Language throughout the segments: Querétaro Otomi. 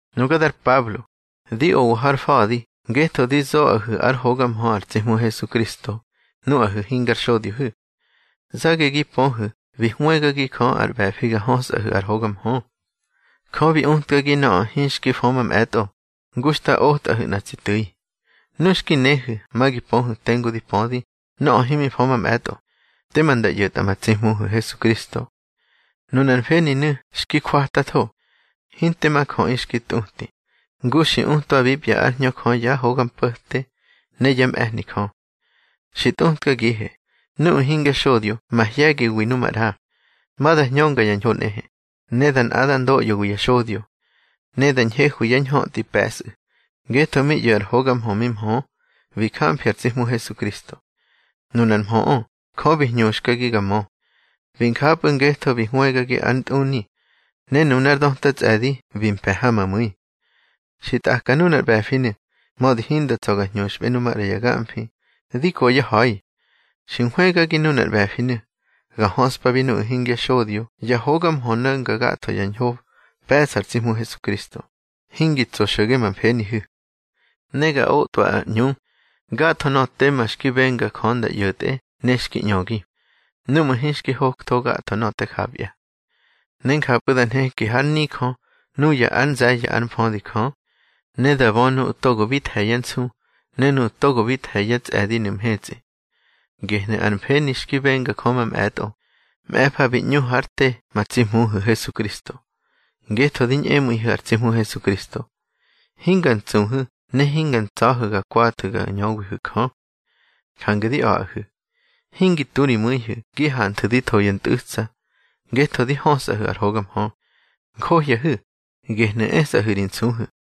Nuga ar Pablo, di owa har fa̱di ngetho di zoꞌahu̱ ár hoga mhö ar tsi Hmu Hesukristo nuꞌahu̱ hingar xodyohu̱. Zage gi pöhu̱ bi hwëgagi Jö ar ꞌbe̱fi ga hösꞌahu̱ ar hoga mhö. Jö bi utkagi nöꞌö hinxki fö mamꞌe̱tꞌo, ngu xta otꞌahu̱ nꞌa tsi tu̱i. Nu xki néhu̱ ma gi pöhu̱ tengu dí pödi nöꞌö himi fö mamꞌe̱tꞌo, tema nda ꞌyo̱tꞌa ma tsi Hmuhu̱ Hesukristo. Nunar mfeninu̱ xki jwatatho, hinte ma jöꞌi xki tꞌuti, ngu xi utwabipya ár Hñö Jö yá hoga mpo̱te ne yá mꞌe̱hni Jö. Xi tꞌutkagihe, nuꞌu̱ hingya xodyo mahye̱giwi nu maꞌra, ma da hñönga ya ñho nꞌehe, ne da nꞌadar ndoꞌyowi ya xodyo. Ne da ñhehwi yá ñhötꞌi pe̱sꞌu̱, ngetho mi ꞌyo̱ ar hoga mhö mi mhö, bi jamfi ar tsi Hmu Hesukristo. Nunar mhöꞌö Jö bi hñuxkagi ga mö. Bi njapꞌu̱ ngetho bi hwëgagi ár ntꞌuni, ne nunár döta tsꞌe̱di bi mpe̱ ha ma mu̱i. Xi tꞌaka nunar ꞌbe̱finu̱, mödi hinda tsa̱ ga ñhuxꞌbe nu maꞌra ya gamfi, di ko ya ha̱i. Xi nhwëgagi nunar ꞌbe̱finu̱, ga höꞌspabi nuꞌu̱ hingya xodyo ya hoga mhö no̱nga gatho ya ñho pe̱ꞌsa ar tsi Hmu Hesukristo, hingi tso xo̱ge ma mfenihu̱. Ne ga otꞌwa ar ꞌñu gatho nöꞌö tema xki benga Jö nda ꞌyo̱tꞌe ne xki ꞌñögi, núꞌmu̱ hinxki hoktho gatho nöꞌö te japya. Ne njapꞌu̱ da nheki hár nijö nuya ár nze̱ye̱ ár mfödi Jö, ne da bö nuꞌu̱ togo bi the̱ yá nsu ne nuꞌu̱ togo bi the̱ yá tsꞌe̱dinu̱ mhetsꞌi. Gehnu̱ ar mfeni xki benga Jö mamꞌe̱tꞌo, mꞌe̱fa bi ꞌñu hár te ma tsi Hmuhu̱ Hesukristo. Ngetho di ñꞌemu̱ihu̱ ar tsi Hmu Hesukristo, hinga ntsuhu̱ ne hinga ntsa̱hu̱ ga kwathu̱ ga ñöwihu̱ Jö. Jange di a̱ꞌahu̱, hingi tu ri mu̱ihu̱ gi hanthu̱ di tho ya ntꞌu̱tsa ngetho di hösꞌahu̱ ar hoga mhö. Njohyahu̱, gehnu̱ esꞌahu̱ ri nsuhu̱.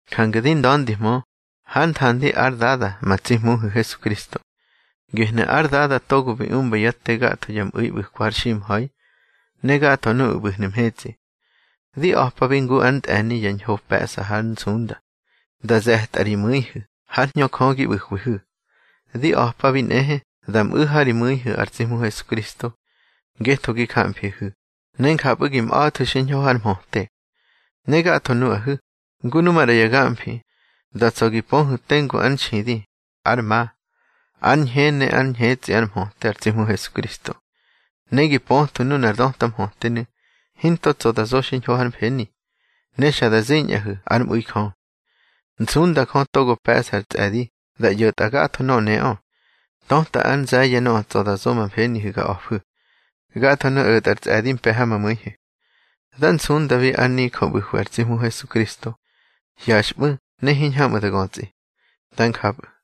Jange di nda̱ndihmö hár nthandi ár Dada ma tsi Hmuhu̱ Hesukristo. Gehnu̱ ár Dada togo bi umba yá te gatho ya mꞌu̱i ꞌbu̱kwa har ximha̱i, ne gatho nuꞌu̱ ꞌbu̱hnu̱ mhetsꞌi. Di a̱pabi ngu ár ntꞌe̱ni yá ñho pe̱ꞌsa hár nsunda, da ze̱tꞌa ri mu̱ihu̱ hár Hñö Jö gi ꞌbu̱hwihu̱. Di a̱pabi nꞌehe da mꞌu̱ ha ri mu̱ihu̱ ar tsi Hmu Hesukristo, ngetho gi jamfihu̱, ne njapꞌu̱ gi mꞌa̱thu̱ xiñho hár mhöte. Ne gatho nuꞌahu̱, ngu nu maꞌra ya gamfi, da tsa̱ gi pöhu̱ tengu ár nxidi, ár ma, ár ñhe ne ár ñhetsꞌi ár mhöte ar tsi Hmu Hesukristo. Ne gi pöthwu̱ nunar döta mhötenu̱ hinto tsa̱ da zo xiñho hár mfeni, ne xa da ziñꞌahu̱ ár mꞌu̱i Jö. Nsunda Jö togo pe̱ꞌsa ar tsꞌe̱di da ꞌyo̱tꞌa gatho nöꞌö neꞌö, töta ár nze̱ye̱ nöꞌö tsa̱ da zo ma mfenihu̱ ga a̱fu̱. Gathonu̱ o̱tꞌa ár tsꞌe̱di mpe̱ ha ma mu̱ihu̱. Dá nsundabi ar nijö ꞌbu̱hwi ar tsi Hmu Hesukristo hyaxꞌmu̱ ne hiñhamꞌu̱ da götsꞌi. Dá njapꞌu̱.